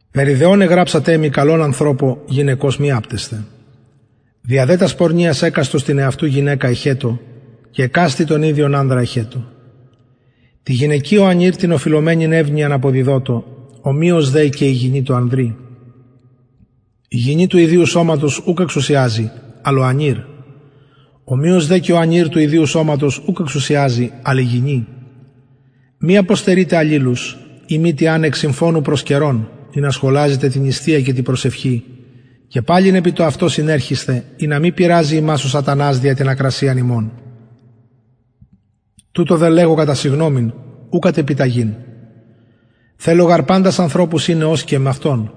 περι δε ων εγραψατε μοι καλον ανθρωπω γυναικος μη απτεσθαι δια δε τας πορνειας εκαστος την εαυτου γυναικα εχετω και εκαστη τον ιδιον ανδρα εχετω τη γυναικι ο ανηρ την οφειλομενην ευνοιαν αποδιδοτω ομοιως δε και η γυνη τω ανδρι η γυνη του ιδιου σωματος ουκ εξουσιαζει αλλ ο ανηρ ομοιως δε και ο ανηρ του ιδιου σωματος ουκ εξουσιαζει αλλ η γυνη μη αποστερειτε αλληλους ει μη τι αν εκ συμφωνου προς καιρον ινα σχολαζητε τη νηστεια και τη προσευχη και παλιν επι το αυτο συνερχησθε ινα μη πειραζη υμας ο σατανας δια την ακρασιαν υμων τουτο δε λεγω κατα συγγνωμην ου κατ επιταγην θελω γαρ παντας ανθρωπους ειναι ως και εμαυτον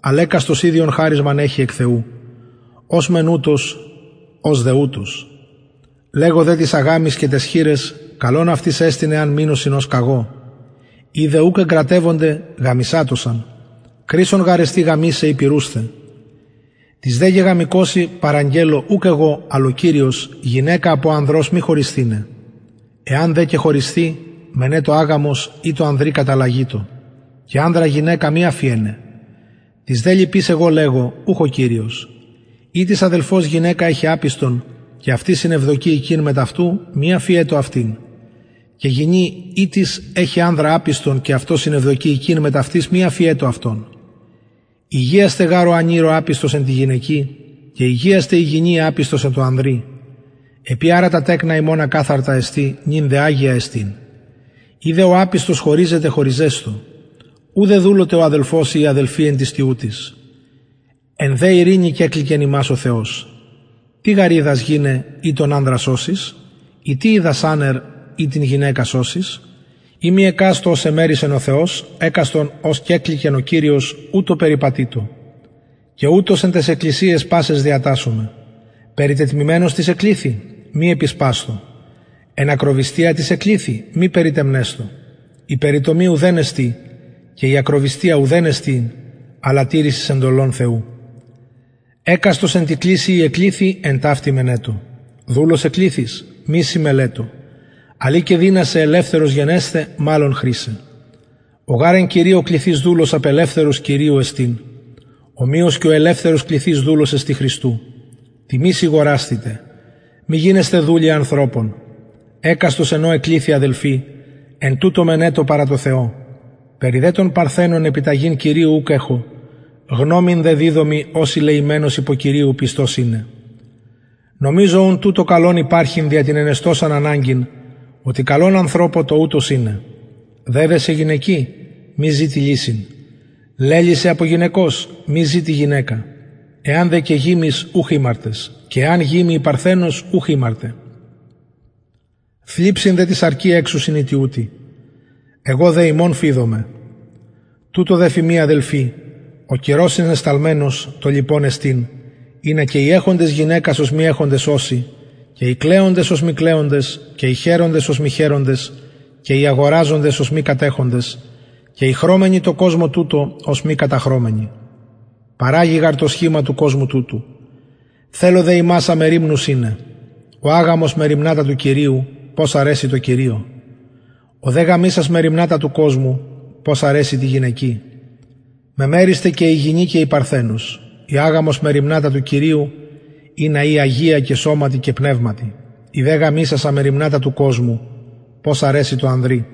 αλλ εκαστος ιδιον χαρισμα εχει εκ θεου ος μεν ουτως ος δε ουτως λεγω δε τοις αγαμοις και ταις χηραις καλον αυτοις εστιν εαν μεινωσιν ως καγω ει δε ουκ εγκρατευονται γαμησατωσαν κρεισσον γαρ εστιν γαμησαι η πυρουσθαι τοις δε γεγαμηκοσιν παραγγελλω ουκ εγω αλλ ο κυριος γυναικα απο ανδρος μη χωρισθηναι εαν δε και χωρισθη μενετω αγαμος η τω ανδρι καταλλαγητω και ανδρα γυναικα μη αφιεναι τοις δε λοιποις εγω λεγω ουχ ο κυριος ει τις αδελφος γυναικα εχει απιστον και αυτη συνευδοκει οικειν μετ αυτου μη αφιετω αυτην και γυνη ητις εχει ανδρα απιστον και αυτος συνευδοκει οικειν μετ αυτης μη αφιετω αυτον ηγιασται γαρ ο ανηρ ο απιστος εν τη γυναικι και ηγιασται η γυνη η απιστος εν τω ανδρι επει αρα τα τεκνα υμων ακαθαρτα εστιν νυν δε αγια εστιν ει δε ο απιστος χωριζεται χωριζεσθω ου δεδουλωται ο αδελφος η η αδελφη εν τοις τοιουτοις εν δε ειρηνη κεκληκεν ημας ο θεος τι γαρ οιδας γυναι ει τον ανδρα σωσεις η τι οιδας ανερ ει την γυναικα σωσεις ει μη εκαστω ως εμερισεν ο θεος εκαστον ως κεκληκεν ο κυριος ουτως περιπατειτω και ουτως εν ταις εκκλησιαις πασαις διατασσομαι περιτετμημενος τις εκληθη μη επισπασθω εν ακροβυστια τις εκληθη μη περιτεμνεσθω η περιτομη ουδεν εστιν και η ακροβυστια ουδεν εστιν αλλα τηρησις εντολων θεου εκαστος εν τη κλησει η εκληθη εν ταυτη μενετω δουλος εκληθης μη σοι μελετω αλλ ει και δυνασαι ελευθερος γενεσθαι μαλλον χρησαι ο γαρ εν κυριω κληθεις δουλος απελευθερος κυριου εστιν ομοιως και ο ελευθερος κληθεις δουλος εστιν χριστου τιμης ηγορασθητε μη γινεσθε δουλοι ανθρωπων εκαστος εν ω εκληθη αδελφοι εν τουτω μενετω παρα θεω περι δε των παρθενων επιταγην κυριου ουκ εχω γνωμην δε διδωμι ως ηλεημενος υπο κυριου πιστος ειναι νομιζω ουν τουτο καλον υπαρχειν δια την ενεστωσαν αναγκην οτι καλον ανθρωπω το ουτως ειναι δεδεσαι γυναικι μη ζητει λυσιν λελυσαι απο γυναικος μη ζητει γυναικα εαν δε και γημης ουχ ημαρτες και εαν γημη η παρθενος ουχ ημαρτεν θλιψιν δε τη σαρκι εξουσιν οι τοιουτοι εγω δε υμων φειδομαι τουτο δε φημι αδελφοι ο καιρος συνεσταλμενος το λοιπον εστιν ινα και οι εχοντες γυναικας ως μη εχοντες ωσιν και οι κλαιοντες ως μη κλαιοντες και οι χαιροντες ως μη χαιροντες και οι αγοραζοντες ως μη κατεχοντες και οι χρωμενοι τω κοσμω τουτω ως μη καταχρωμενοι παραγει γαρ το σχημα του κοσμου τουτου θελω δε υμας αμεριμνους ειναι ο αγαμος μεριμνα τα του κυριου πως αρεσει τω κυριω ο δε γαμησας μεριμνα τα του κοσμου πως αρεσει τη γυναικι μεμερισται και η γυνη και η παρθενος η αγαμος μεριμνα τα του κυριου ινα η αγια και σωματι και πνευματι η δε γαμησασα μεριμνα τα του κοσμου πως αρεσει τω ανδρι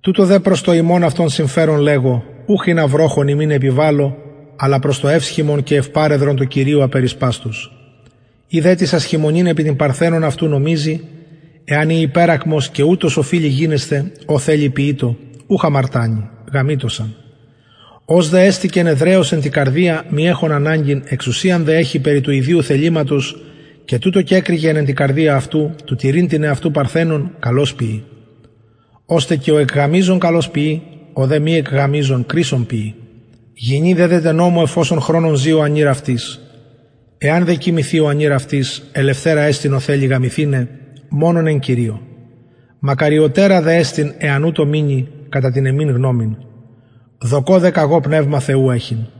τουτο δε προς το υμων αυτων συμφερον λεγω ουχ ινα βροχον υμιν επιβαλω αλλα προς το ευσχημον και ευπροσεδρον τω κυριω απερισπαστως ει δε τις ασχημονειν επι την παρθενον αυτου νομιζει εαν η υπερακμος και ουτως οφειλει γινεσθαι ο θελει ποιειτω ουχ αμαρτανει γαμειτωσαν ος δε εστηκεν εδραιος εν τη καρδια μη εχων αναγκην εξουσιαν δε εχει περι του ιδιου θεληματος και τουτο κεκρικεν εν τη καρδια αυτου του τηρειν την εαυτου παρθενον καλως ποιει ωστε και ο εκγαμιζων καλως ποιει ο δε μη εκγαμιζων κρεισσον ποιει γυνη δεδεται νομω εφ οσον χρονον ζη ο ανηρ αυτης εαν δε και κοιμηθη ο ανηρ ελευθερα εστιν ω θελει γαμηθηναι μονον εν κυριω μακαριωτερα δε εστιν εαν ουτως μεινη κατα την εμην γνωμην δοκω δε καγω πνευμα θεου εχειν